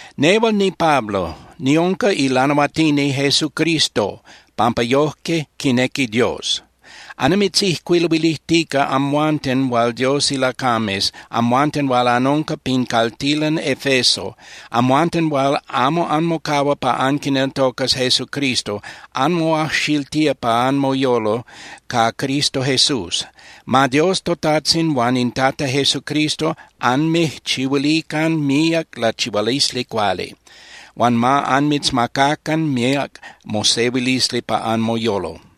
Nehual niPablo, niunca ilanahuatini Jesucristo pampa yoje quinequi Dios. Annimitzijcuiluilijtica amhuanten hual Dios ilacames, amhuanten hual anunca pin caltilan Efeso. Amhuanten hual amo anmocahua pa anquineltocas Jesucristo, anmoajxiltía pa anmoyolo ca Cristo Jesús. Ma Dios toTajtzin huan in Tata Jesucristo anmijchihuilican míac lachihualisli cuali. Huan ma anmitzmacacan míac mosehuilisli pa anmoyolo.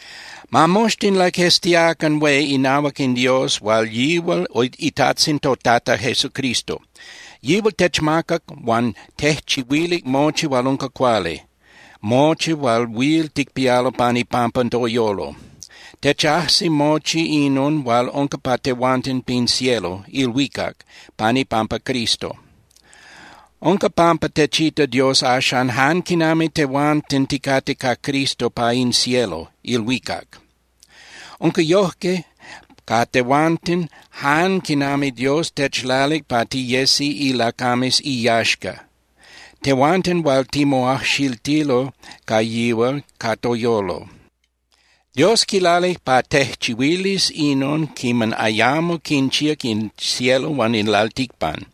Ma moxtin laqueztiacan hué inahuac in Dios hual yihual iTajtzin toTata Jesucristo. Yihual techmacac huan tejchihuilic mochi hual unca cuali, mochi hual huil ticpialo pan ipampa toyolo. Techajsi mochi inon hual unca pa tehuanten pin cielo (ilhuicac) pan ipampa Cristo. Unca pampa techita Dios axan jan quinami tehuanten ticate ca Cristo pa in cielo (ilhuicac). Unca yoje ca tehuanten jan quinami Dios techlalic pa tiyesi ilacames iyaxca, tehuanten hual timoajxiltilo ca yihual ca toyolo. Dios quilalic pa tejchihuilis inon quiman ayamo quinchíac in cielo huan in lalticpan.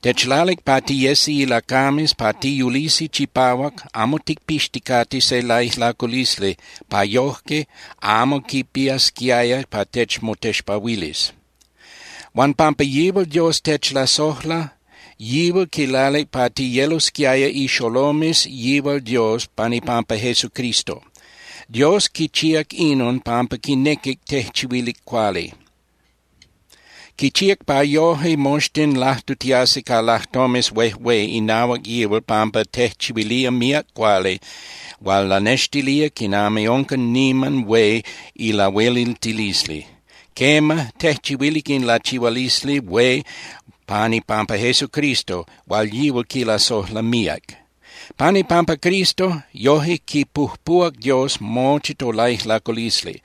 Techlalic pa tiyesi ilacames pa tiyulisi chipahuac amo ticpixticate se laijlaculisli pa yoje amo quipiasquiaya pa techmotexpahuilis. Huan pampa yihual Dios techlasojla, yihual quilalic pa tiyelosquiaya ixolomes yihual Dios pan ipampa Jesucristo. Dios quichíac inon pampa quinequic tejchihuilic cuali. Quichíac pa yoje moxtin lajtutiasi ca lajtomes huejué inahuac yihual pampa tejchihuilía míac cuali hual lanextilía quinami unca niman hué ilahueliltilisli. Quema, tejchihuilic in lachihualisli hué pan ipampa Jesucristo hual yihual quilasojla míac. Pan ipampa Cristo, yoje quipujpuhuac Dios mochi tolaijlaculisli.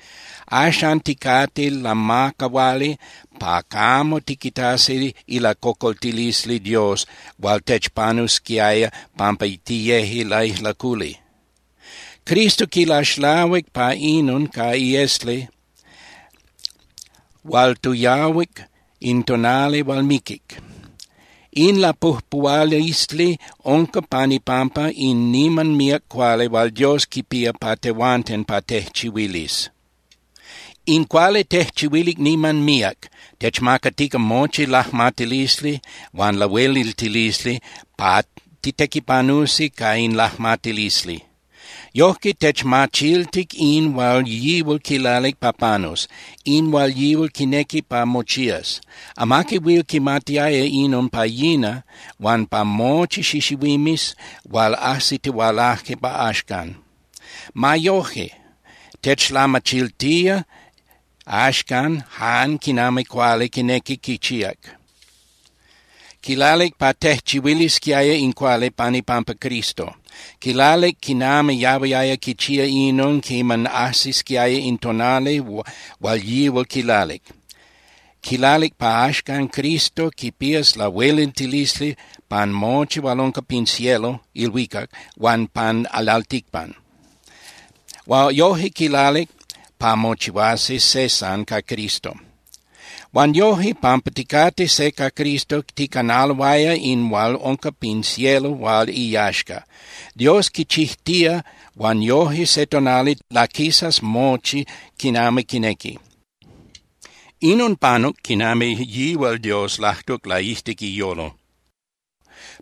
Axan ticate lamacahuali pa camo tiquitasi ilacocoltilisli Dios hual techpanusquiaya pampa tiyeje laijlaculi. Cristo quilaxlahuic pa inon ca iesli hual toyahuic in tonali hual miquic. In lapujpuhualisli unca pan ipampa in niman míac cuali hual Dios quipía pa tehuanten pa tejchihuilis. In cuali tejchihuilic niman míac, techmacatica mochi lajmatilisli huan lahueliltilisli pa titequipanusi ca in lajmatilisli. Yojque techmachiltic in hual yihual quilalic pa panus, in hual yihual quinequi pa mochías. Amaqui huil quimatiaya inon pa yina huan pa mochi xixihuimes hual ajsitihualaje pa axcan. Ma yoje, techlamachiltía axcan jan quinami cuali quinequic quichíac. Quilalic pa tejchihuilisquiaya in cuali pan ipampa Cristo. Quilalic quinami yahuiaya quichía inon quiman ajsisquiaya in tonali hual yihual quilalic. Quilalic pa axcan Cristo quipías lahueliltilisli pan mochi hual unca pin cielo (ilhuicac) huan pan lalticpan. Yoje quilalic pa mochihuasi se san ca Cristo. Huan noje, pampa ticate se ca Cristo, ticanaloaya in hual unca pin cielo hual iyaxca. Dios quichijtía huan yoje se tonali laquisas mochi quinami quinequi. Inon panuc quinami yihual Dios lajtuc laijtic iyolo.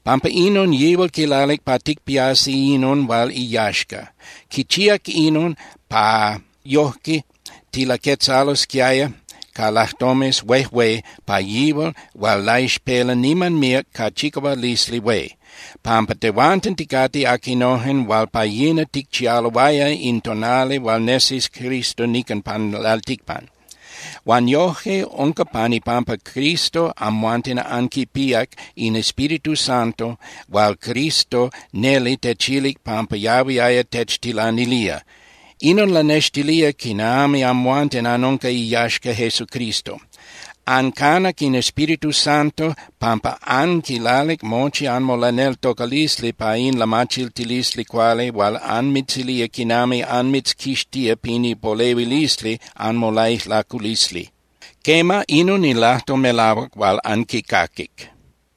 Pampa inon yihual quilalic pa ticpiasi inon hual iyaxca. Quichíac inon pa yojque tilaquetzalosquiaya ca lajtomes huejué pa yihual hual laixpela niman míac ca chicahualisli hué, pampa tehuanten ticate aquinojen hual pa yina ticchialoaya in tonali hual nesis Cristo nican pan lalticpan. Huan yoje, unca pan ipampa Cristo amhuanten anquipíac in Espíritu Santo hual Cristo neli techilic pampa yahuiaya techtilanilía. Inon lanextilía quinami amhuanten anunca iyaxca Jesucristo. Ancanac in Espíritu Santo pampa anquilalic mochi anmolaneltocalisli pa in lamachiltilisli cuali hual anmitzilía quinami anmitzquixtía pin ipolehuilisli anmolaijlaculisli. Quema, inon in lajtol melahuac hual anquicaquic.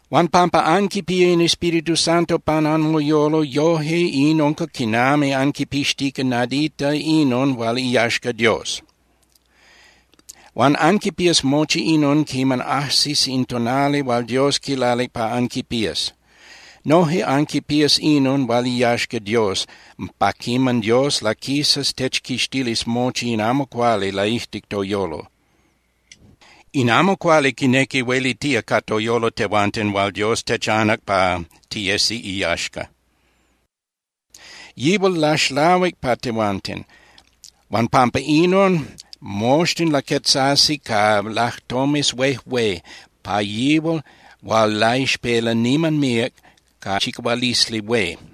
Huan pampa anquipía in Espíritu Santo pan anmoyolo, yoje in unca quinami anquipixtica nadita inon hual iyaxca Dios. Huan anquipías mochi inon quiman ajsis in tonali hual Dios quilalic pa anquipías. Noje anquipías inon hual iyaxca Dios pa quiman Dios laquisas techquixtilis mochi in amo cuali laijtic toyolo. In amo cuali quinequi huelitía ca toyolo tehuanten hual Dios techanac pa tiyesi iyaxca. Yihual laxlahuic pa tehuanten. Huan pampa inon, moxtin laquetzasi ca lajtomes huejué pa yihual hual laixpela niman míac ca chicahualisli hué.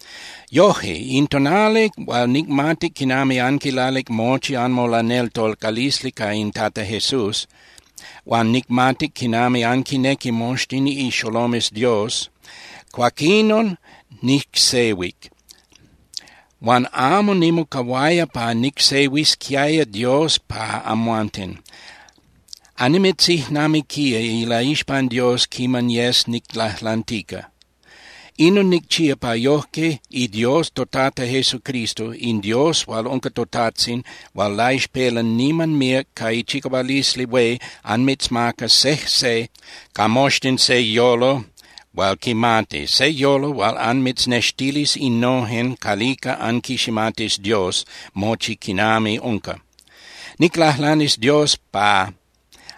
Yoje, in tonali hual nicmatic quinami anquilalic mochi anmolaneltocalisli ca in Tata Jesús, huan nicmatic quinami anquinnequi moxtin ixolomes Dios, cuaquinon nicsehuic. Huan amo nimocahuaya pa nicsehuisquiaya Dios pa amhuanten. Annimitzijnamiquía ilaixpan Dios quiman yes niclajlantica. Inon nicchía pa yojque iDios toTata Jesucristo, in Dios hual unca toTajtzin hual laixpela niman míac ca ichicahualisli hué anmitzmacas sejse ca moxtin se yolo hual quimati, se yolo hual anmitznextilis innojen calica anquiximatis Dios mochi quinami unca. Niclajlanis Dios pa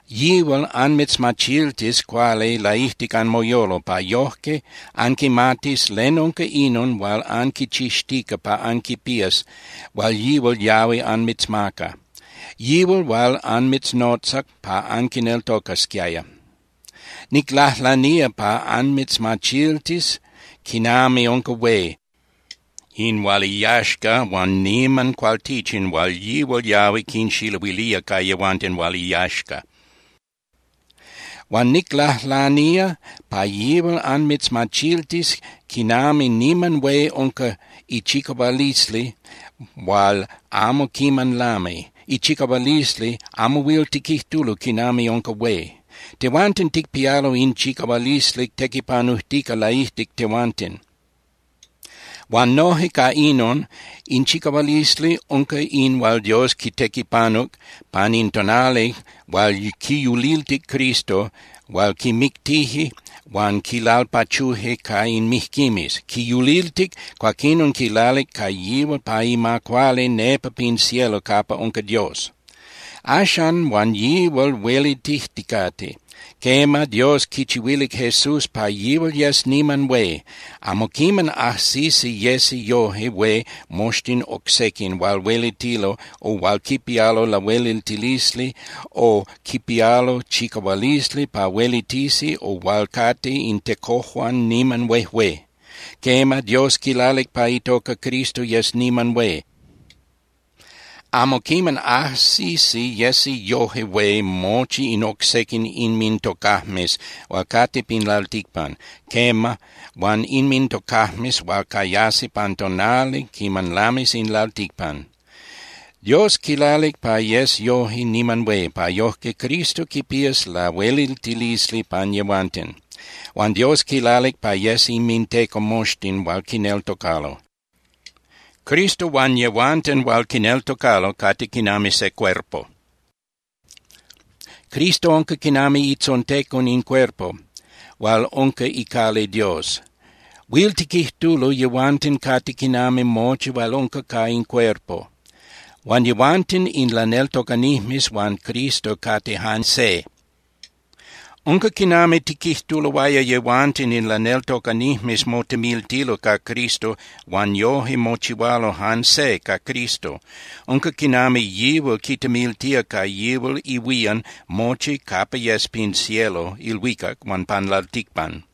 yihual anmitzmachiltis cuali laijtic anmoyolo, pa yojque anquimatis len unca inon hual anquichixtica pa anquipías hual yihual yahui anmitzmaca, yihual hual anmitznotzac pa anquineltocasquiaya. Niclajlanía pa anmitzmachiltis quinami unca hué in hual iyaxca huan niman cualtichin hual yihual yahui quinxiluilía ca yehuanten hual iyaxca. Huan niclajlanía pa yihual anmitzmachiltis quinami niman hué unca ichicahualisli hual amo quiman lami, ichicahualisli amo huil tiquijtulo quinami unca hué. Tehuanten ticpialo in chicahualisli tequipanujtica laijtic tehuanten. Huan noje ca inon, in chicahualisli unca in hual Dios quitequipanuc pan in tonali hual quiyuliltic Cristo hual quimictije huan quilalpachuje ca in mijquimes. Quiyuliltic, cuaquinon quilalic ca yihual pa ima cuali nepa pin cielo capa unca Dios. Axan huan yihual huelitijticate. Quema, Dios quichihuilic Jesús pa yihual yes niman hué. Amo quiman ajsisi yesi yoje hué moxtin oc sequin hual huelitilo o hual quipialo lahueliltilisli o quipialo chicahualisli pa huelitisi o hual cate in tecojuan niman huejué. Quema, Dios quilalic pa itoca Cristo yes niman hué. Amo quiman ajsisi yesi yoje hué mochi in oc sequin inmintocajmes hual cate pin lalticpan, quema, huan inmintocajmes hual cayasi pan tonali quiman lamis in lalticpan. Dios quilalic pa yes yoje niman hué, pa yojque Cristo quipías lahueliltilisli pan yehuanten. Huan Dios quilalic pa yes inminteco moxtin hual quineltocalo. Cristo huan yehuanten hual quineltocalo cate quinami se cuerpo. Cristo unca quinami itzontecon in cuerpo, hual unca icali Dios. Huil tiquijtulo yehuanten cate quinami mochi hual unca ca in cuerpo. Huan yehuanten in laneltocanijmes huan Cristo cate jan se. Unca quinami tiquijtuloaya yehuanten in laneltocanijmes motemiltilo ca Cristo huan yoje mochihualo jan se ca Cristo. Unca quinami yihual quitemiltía ca yihual ihuían mochi capa yes pin cielo (ilhuicac) huan pan lalticpan.